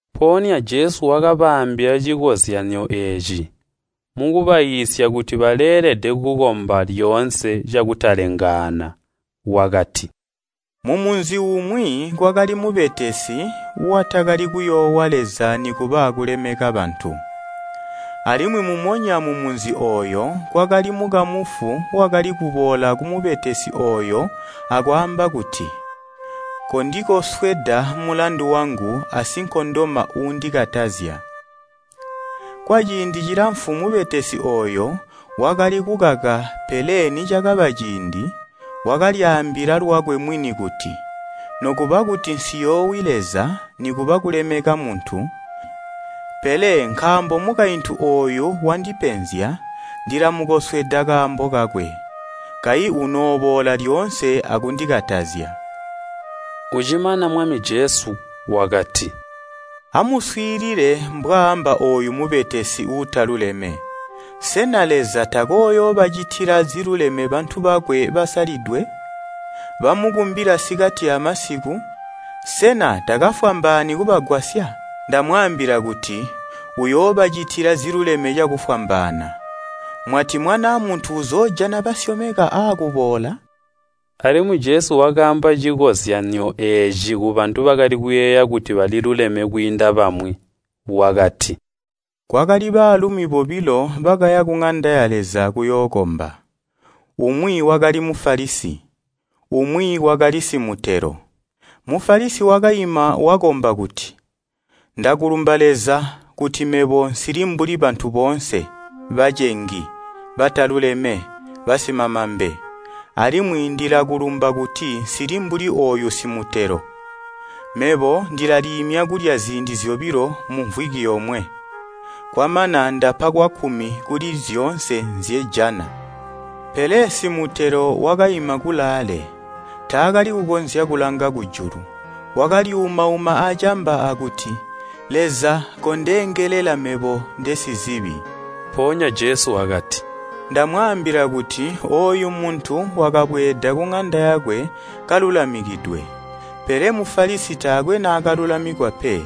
Mpoonya Jesu wakabaambila cikozyanyo eeci, mukubaiisya kuti baleelede kukomba lyoonse cakutalengaana. Wakati, “Mumunzi umwi kwakali mubetesi, watakali kuyoowa Leza nikuba kulemeka bantu. Alimwi mumonya mumunzi ooyo kwakali mukamufu wakali kuboola kumubetesi ooyo akwaamba kuti, ‘Kondikosweda mulandu wangu asinkondoma uundikatazya!’ Kwaciindi cilamfu mubetesi ooyo wakali kukaka pele nicakaba ciindi, wakalyaambila lwakwe mwini kuti, ‘Nokuba kuti nsiyoowi Leza nikuba kulemeka muntu, pele nkaambo mukaintu ooyu wandipenzya, ndilamukosweda kaambo kakwe, kayi unooboola lyoonse akundikatazya!’” Ucimana Mwami Jesu wakati, “Amuswiilile mbwaamba ooyu mubetesi uutaluleme. Sena Leza takooyoobacitila ziluleme bantu bakwe basalidwe, bamukumbila sikati amasiku? Sena takafwambaani kubagwasya? Ndamwaambila kuti, uyoobacitila ziluleme cakufwambaana. Mwati Mwanaa Muntu uzoojana basyomeka aakuboola?” Alimwi Jesu wakaamba cikozyanyo eeci kubantu bakali kuyeeya kuti baliluleme kwiinda bamwi. Wakati, “Kwakali baalumi bobilo bakaya kuŋanda ya Leza kuyookomba. Umwi wakali Mufalisi, umwi wakali simutelo. Mufalisi wakaima wakomba kuti, ‘Ndakulumba Leza, kuti mebo nsili mbuli bantu boonse, bacengi, bataluleme, basimamambe, alimwi ndilakulumba kuti nsili mbuli ooyu simutelo. Mebo ndilaliimya kulya ziindi zyobilo mumvwiki yomwe, kwamana ndapa kwakkumi kuli zyoonse nzyejana.’ “Pele simutelo wakaima kulaale, taakali kukonzya akulanga kujulu, wakalyuumauma acamba akuti, ‘Leza, kondeengelela mebo, ndesizibi!’” Mpoonya Jesu wakati, “Ndamwaambila kuti ooyu muntu wakabweeda kuŋanda yakwe kalulamikidwe, pele Mufalisi taakwe naakalulamikwa pe.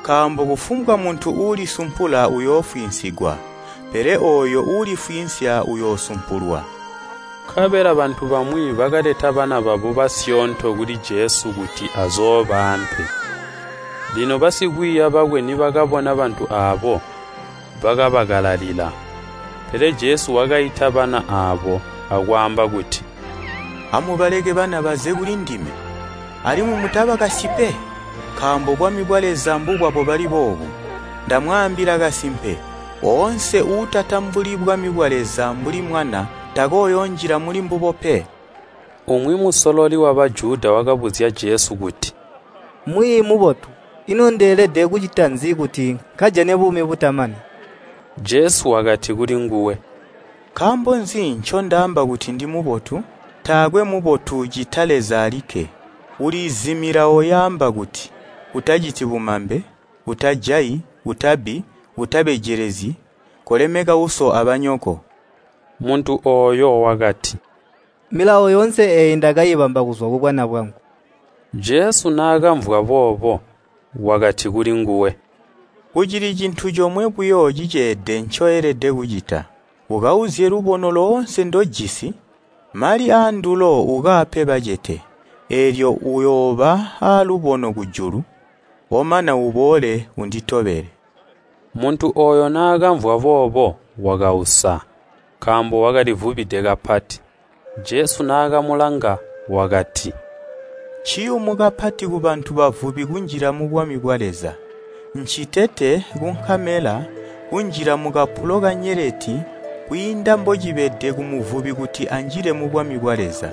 Nkaambo kufumbwa muntu uulisumpula uyoofwiinsigwa, pele ooyo uulifwiinsya uyoosumpulwa.” Nkabela bantu bamwi bakaleta bana babo kuli Jesu kuti azoobaampe. Lino basikwiiya bakwe nibakabona bantu aabo, bakabakalalila. Pele Jesu wakaita bana aabo, akwaamba kuti, “Amubaleke bana baze kulindime, alimwi mutabakasyi pe, nkaambo bwami bwa Leza mbubwabo bali boobu. Ndamwaambila kasimpe, oonse uutatambuli bwami bwa Leza mbuli mwana, takooyoonjila mulimbubo pe.” Umwi musololi wa Bajuda wakabuzya Jesu kuti, “Mwiiyi mubotu, ino ndeelede kucita nzi kuti nkajane buumi butamani?” Jesu wakati kulinguwe, “Nkaambo nzi ncondaamba kuti ndimubotu? Taakwe mubotu, ccita Leza alikke. Uliizi milawo yaamba kuti, ‘Utaciti bumambe, utajayi, utabbi, utabejelezyi, kolemeka uso abanyoko.’” Muntu ooyo wakati, “Milawo yoonse eeyi ndakaibamba kuzwa kubwana bwangu.” Jesu naakamvwa boobo, wakati kulinguwe, “Kucili cintu comwe buyo ciceede ncoelede kucita. Ukauzye lubono loonse ndojisi, mali aandulo ukaape bacete, eelyo uyooba alubono kujulu, omana uboole unditobele.” Muntu ooyo naakamvwa boobo wakausa, nkaambo wakalivubide kapati. Jesu naakamulanga wakati, “Nciyumu kapati kubantu bavubi kunjila mubwami bwa Leza! Ncitete kunkamela kunjila mukapulo kanyeleti kwiinda mbocibede kumuvubi kuti anjile mubwami bwa Leza.”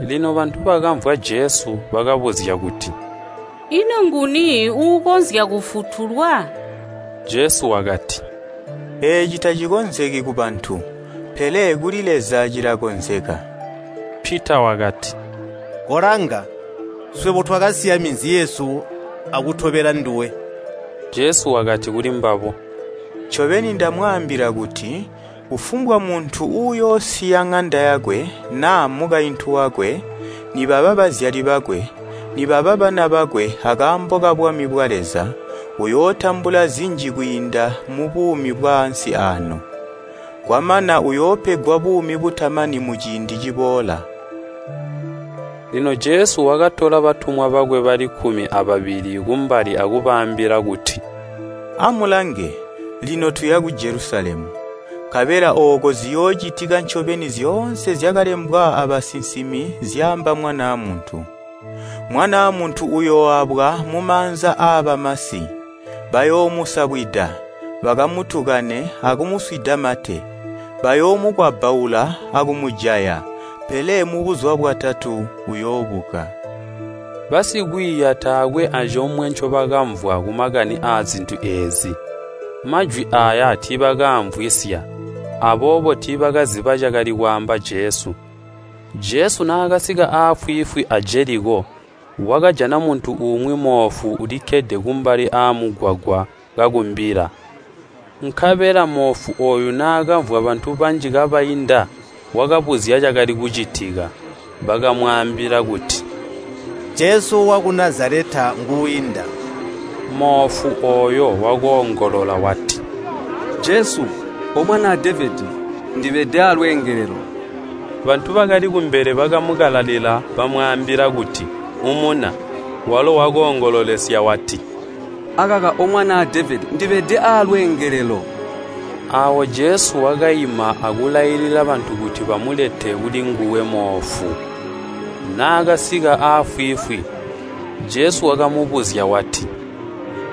Lino bantu bakamvwa Jesu bakabuzya kuti, “Ino nguni uukonzya kufutulwa?” Jesu wakati, “Eeci tacikonzeki kubantu, pele kuli Leza cilakonzeka.” Pita wakati, “Kolanga! Swebo twakasiya minzi yesu akutobela nduwe.” Jesu wakati kulimbabo, “Ncobeni ndamwaambila kuti kufumbwa muntu uuyoosiya ŋanda yakwe, naa mukaintu wakwe, nibaba bazyali bakwe, nibaba bana bakwe akaambo kabwami bwa Leza, uyootambula zinji kwiinda mubuumi bwaansi aano, kwamana uyoopegwa buumi butamani muciindi ciboola.” Lino Jesu wakatola batumwa bakwe bali kkumi ababili kumbali akubaambila kuti, “Amulange! Lino tuya ku Jelusalemu, nkabela ooko ziyoocitika ncobeni zyoonse zyakalembwa abasinsimi zyaamba Mwanaa Muntu. Mwanaa Muntu uyooabwa mumaanza aabamasi, bayoomusabwida, bakamutukane akumuswida mate. Bayoomukwabbaula akumujaya, pele mubuzuba bwatatu uyoobuka.” Basikwiiya taakwe acomwe ncobakamvwa kumakani aazintu eezi. Majwi aaya tiibakaamvwisya, aboobo tiibakaziba cakali kwaamba Jesu. Jesu naakasika afwiifwi a Jeliko, wakajana muntu umwi moofu ulikkede kumbali aamugwagwa, kakumbila. Nkabela moofu ooyo naakamvwa bantu banji kabainda, wakabuzya cakali kucitika. Bakamwaambila kuti, “Jesu waku Nazaleta nguuinda.” Moofu ooyo wakoongolola wati, “Jesu, O Mwanaa Devedi! Ndibede aalwengelelo.” Bantu bakali kumbele bakamukalalila bamwaambila kuti, “Umuna,” walo wakoongololesya wati, “Akaka O Mwanaa Devedi ndibede aalweengelelo.” Aawo Jesu wakaima akulailila bantu kuti bamulete kulinguwe moofu. Naakasika afwiifwi, Jesu wakamubuzya wati,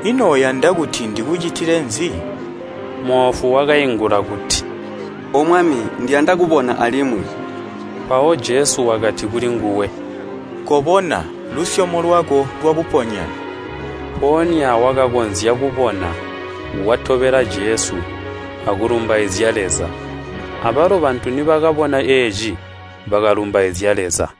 “Ino uyanda kuti ndikucitile nzi?” Moofu wakaingula kuti, “O Mwami, ndiyanda kubona alimwi.” Mpawo Jesu wakati kulinguwe, “Kobona! Lusyomo lwako lwakuponya.” Mpoonya wakakonzya kubona, watobela Jesu, akulumbaizya Leza. Abalo bantu nibakabona eeci, bakalumbaizya Leza.